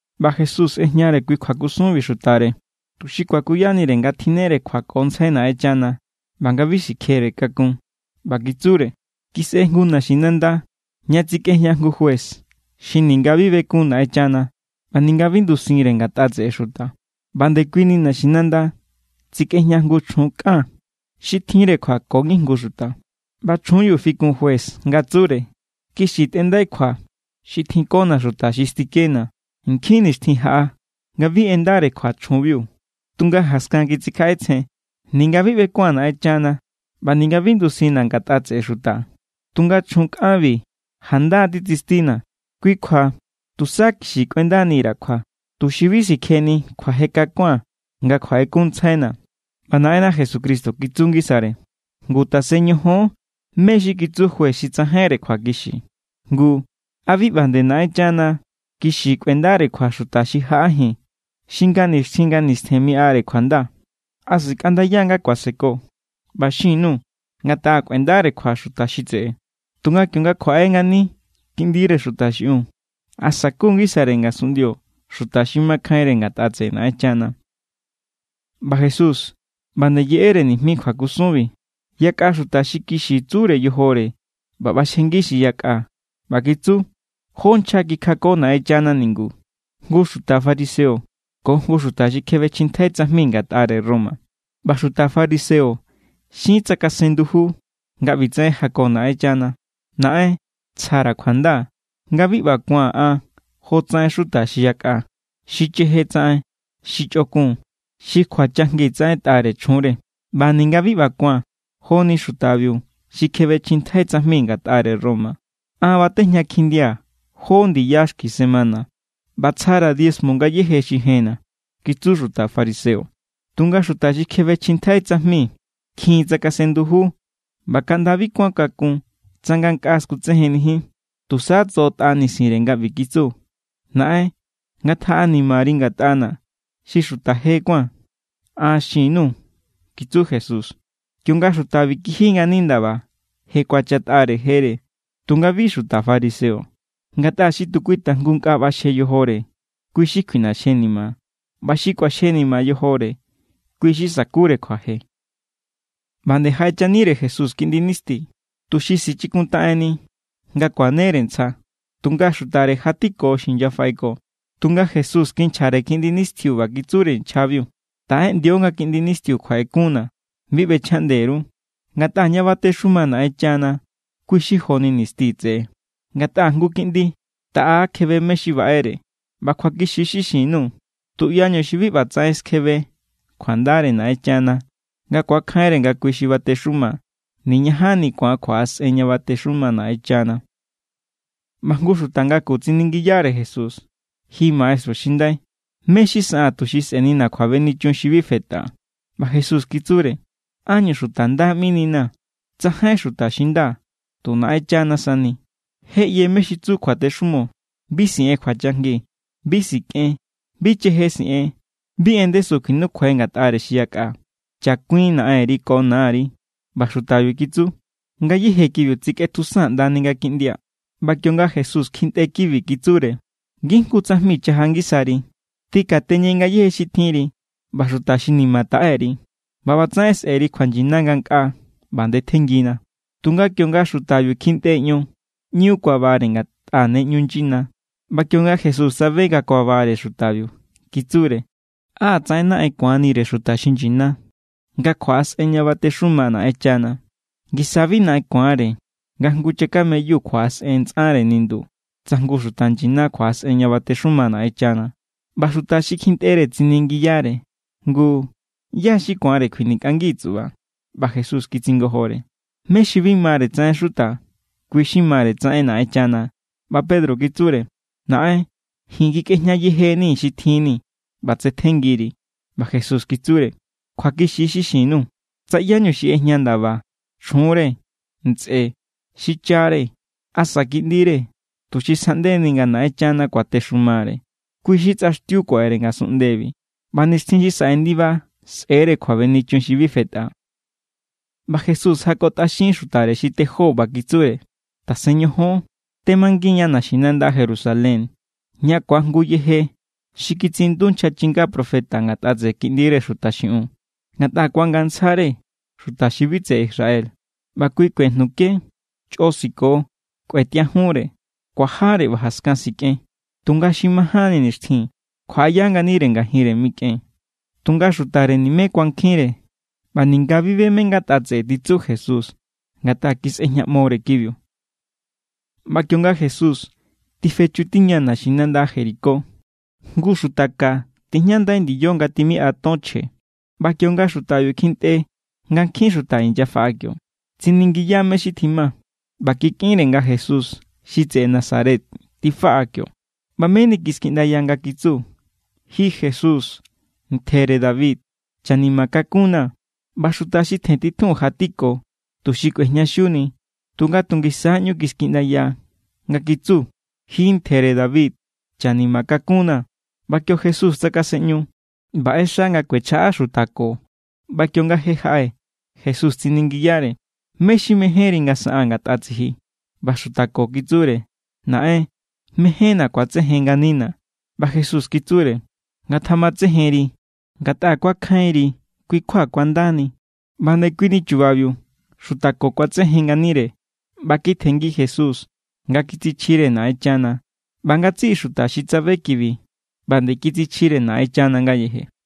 ꞌBa Jesús ꞌejñare kui kjuakusunbi xutare, tuxi kuakuyanire nga tjinnere kjuakontsjai Naꞌenchana, ꞌba nga bi sikjere kakun. ꞌBa kitsure: —Kisꞌe jngu naxinanda ña tsikꞌejña jngu juez xi ninga bi bekun Naꞌenchana ꞌba ninga bi ndusinre ngatꞌa tseꞌe xuta. ꞌBa ndekuini naxinanda tsikꞌejña jngu chjun kꞌan xi tjinre kjua ko ngijngu xuta. ꞌBa chjunbiu fikun juez nga tsure: “Kixi tꞌendai kjua xi tjinkona̱ xuta xi stikena̱.” Nkjin nixtjin jaꞌa nga bi ꞌendare kjua chjunbiu. Tunga jaskan kitsikjaꞌetsjen: “Ninga bi ꞌbekua̱n Naꞌenchana ꞌba ninga bi ndusinna̱ ngatꞌa tseꞌe xuta, tunga chjun kꞌanbi janda titsistina̱. Kui kjua tusa kixi kꞌuendani_ra̱ kjua, tuxi bi sikjeni kjuaje kakua̱n nga kjuaꞌekunntsjaina̱.” ꞌBa Naꞌenna Jesucristo kitsu ngisare: —Ngu, tasen ñojon mé= xi kitsu juez xi tsajainre kjuakixi. Ngu, ¿a bi ꞌba nde Naꞌenchana kixi kꞌuendare kjua xuta xi jaꞌajin, xi nga nixtjin nga nistjen miꞌare kjuanda? ¿A sikꞌandaya= nga kuaseko? ꞌBa xin_nuu̱ nga taꞌa kꞌuendare kjua xuta xi tseꞌe. Tunga kionga kjuaꞌe ngani Kiꞌndire Xuta xiꞌiun, ¿a saku ngisare ngasunꞌndio xuta xi makjainre ngatꞌa tseꞌe Naꞌenchana? ꞌBa Jesús ꞌba nde yeꞌere nijmi kjuakusunbi yakꞌa xuta xi kixi tsure yojore ꞌba ꞌbaxjengi xi yakꞌa. ꞌBa kitsu: —Jó nchja kikjako Naꞌenchana ningu, jngu xuta fariseo ko jngu xuta xi kjebechjintjai tsajmi ngatꞌare Roma. ꞌBa xuta fariseo xin tsakasen nduju nga ꞌbitsaꞌen jako Naꞌenchana: “Naꞌen, tsjara̱ kjuanda, ngatꞌa bi ꞌba kuaa̱n an jotsaꞌen xuta xi yakꞌa, xi cheje tsaꞌen, xi chꞌokun, xi kjuachajngi tsaꞌentꞌare chjunre. ꞌBa ninga bi ꞌba kuaa̱n joni xutabiu xi kjebechjintjai tsajmi ngatꞌare Roma. An batejña kjindia̱ jó ndiya xki semana, ꞌba tsjara̱ diezmo ngayéje xi jenna̱”, kitsu xuta fariseo. Tunga xuta xi kjebechjintjai tsajmi kjin tsakasen nduju ꞌba kaꞌnda bi kuán kakun tsa ngankꞌaa skutsejennijin. Tusa tsoꞌotꞌa nisinre nga ꞌbi kitsu: “Naꞌen, ngatjaꞌanimari ngatꞌana̱ xi xuta je kuáa̱n.” An xin_nuu̱ —kitsu Jesús—, kionga xutabi kiji ngani ndaba, je kuachatꞌare jere, tunga bi xuta fariseo. Ngatꞌa xi tu kui tajngu nkꞌa ꞌbaxje yojore, kui= xi kjuiꞌnaxjenima. ꞌBa xi kꞌuaxjenima yojore, kui= xi sakure kjuaje. ꞌBa nde jaꞌechanire Jesús kiꞌndi nisti, tuxi sichikuntaꞌenni nga kuanere ntsja; tunga xutare jatiko xi inyafaꞌeko. Tunga Jesús kinchjare kiꞌndi nistiu ꞌba kitsure nchjabiu: —Taꞌeꞌndio nga kiꞌndi nistiu kjuaꞌekunna̱, bi ꞌbechjaꞌnde_ru, ngatꞌa ña batexuma Naꞌenchana kui= xi joni nisti tseꞌe. Ngatꞌa jngu kiꞌndi taꞌa kjebe mé= xi baꞌere. ꞌBa kjuakixi= xi xin_nuu̱, tuꞌyañu xi bi ꞌba tsaꞌen skjebe kjuandare Naꞌenchana nga ku̱akjainre nga kui xi batexuma, niñajanni ku̱an kjuaꞌasꞌen ña batexuma= Naꞌenchana. ꞌBa jngu xuta ngaku tsiningiyare Jesús: —Ji Maestru xi ndai, ¿mé= xi saꞌaa̱n, tuxi sꞌe̱nina̱ kjuabenichun xi bi fetꞌa? ꞌBa Jesús kitsure: —¿Ánñu xuta nda ꞌmininaa̱? Tsajainjín xuta xi nda, tu Naꞌenchana sani. Je ꞌye mé= xi tsu kjuatexumo: “Bi siꞌen kjuachajngi; bi sikꞌen; bi cheje siꞌen; bi en ndesu kjuinukjuai ngatꞌare xi yakꞌa; chakuin naꞌenri ko nari.” ꞌBa xutabiu kitsu: —Ngayéje kibiu tetsikꞌetjusaa̱n ꞌndani nga kindia̱. ꞌBa kionga Jesús kjintꞌe kibi, kitsure: —Ngijngu tsajmi chaja ngisari: tꞌikateñe ngayéje xi tjinri ꞌba xuta xi ni̱ma̱ taꞌe_ri, ꞌba ꞌbatsaꞌen sꞌe̱ri kjuanyina ngankꞌaa; ꞌba ndetjenngina. Tunga kionga xutabiu kjintꞌe ion, ꞌñu kuabare, ngatꞌa ne ꞌñu nyina. ꞌBa kionga Jesús tsabe nga kuabare xutabiu, kitsure: —¡Á tsaꞌen naꞌen ku̱anire xuta xi nyina nga kjuaꞌasꞌen ña batexuma Naꞌenchana! Ngisa= bi naꞌen ku̱anre nga jngu chakameyu kjuaꞌasꞌen ntsꞌare nindu, tsa jngu xuta nyina kjuaꞌasꞌen ña batexuma Naꞌenchana. ꞌBa xuta xi kjintꞌere tsiningiyare: —Ngu, ¿ꞌyá= xi ku̱anre kjuinikꞌangi tsuꞌba? ꞌBa Jesús kitsingojore: —Mé xi bi mare tsaꞌen xuta, kui= xi mare tsaꞌen Naꞌenchana. ꞌBa Pedro kitsure: —Naꞌen, ji̱n kjinikꞌejña yejenii̱ mé= xi tjinni̱, ꞌba tsetjenngiri̱. ꞌBa Jesús kitsure: —Kjuakixi= xi xin_nuu̱, tsa ꞌyáñu xi ꞌejña ndaba, chjunre, ntsꞌe, xichare, asa kiꞌndire, tuxi sjaꞌndeni nga Naꞌenchana kuatexumare, kui xi tsꞌaxtiu kuaꞌere ngasunꞌndebi, ꞌba nixtjin xi saꞌe ndiba sꞌe̱re kjuabenichun xi bi fetꞌa. ꞌBa Jesús jakotꞌaxin xutare xi tejó, ꞌba kitsure: —Tasen ñojon. Temangin=ña naxinanda Jerusalén ña ku̱ajngu yeje xi kitsiꞌindu nchja chinga profeta ngatꞌa tseꞌe Kiꞌndire Xuta xiꞌiun. Ngatꞌa ku̱angantsjare xuta xi bi tseꞌe Israel, ꞌba kui kuejnuke, chꞌo siko, kꞌuetiajunre, kuajare ꞌba jaskan sikꞌen. Tunga xi majánni nixtjin kjuaꞌaya nganire ngajinre mikꞌen. Tunga xutare nimé kuankjinre, ꞌba ninga bi be mé= ngatꞌa tseꞌe xi titsu Jesús, ngatꞌa kisꞌejñaꞌmore kibiu. ꞌBa kionga Jesús tifechutiña naxinanda Jericó, jngu xuta ka tijñandai ndiyo nga tjimiꞌa ton chje. ꞌBa kionga xutabiu kjintꞌe nga nkjin xuta inyafaꞌa, tsiningiya mé= xi tjima. ꞌBa kikꞌinre nga Jesús xi tseꞌe Nazaret tifaꞌa kio. ꞌBa meni kiskiꞌndaya nga kitsu: —¡Ji Jesús, ntjere David, chanima kakunnaa̱! ꞌBa xuta xi tjentitjun jatiko, tuxi kꞌuejñaxiuni, tunga tu ngisa= ꞌñu kiskiꞌndaya nga kitsu: —¡Ji ntjere David, chanima kakunnaa̱! ꞌBa kio Jesús tsakasenꞌñu, ꞌba ꞌexa nga kuechjaꞌa xuta ko. ꞌBa kionga je jaꞌe, Jesús tsiningiyare: —¿Mé= xi mejénri nga saꞌaa̱n ngatꞌa tsiji? ꞌBa xuta ko kitsure: —Naꞌen, mejénna̱ ku̱atsejen nganina̱. ꞌBa Jesús kitsure: —Ngatjamatsejenri. Ngatꞌa kuakjainri, kui kjua kuandani. ꞌBa ndekuini chubabiu xuta ko kuatsejen nganire ꞌba kitjenngi Jesús nga kitsichjire Naꞌenchana. ꞌBa ngatsiꞌi xuta xi tsabe kibi, ꞌba nde kitsichjire Naꞌenchana ngayeje.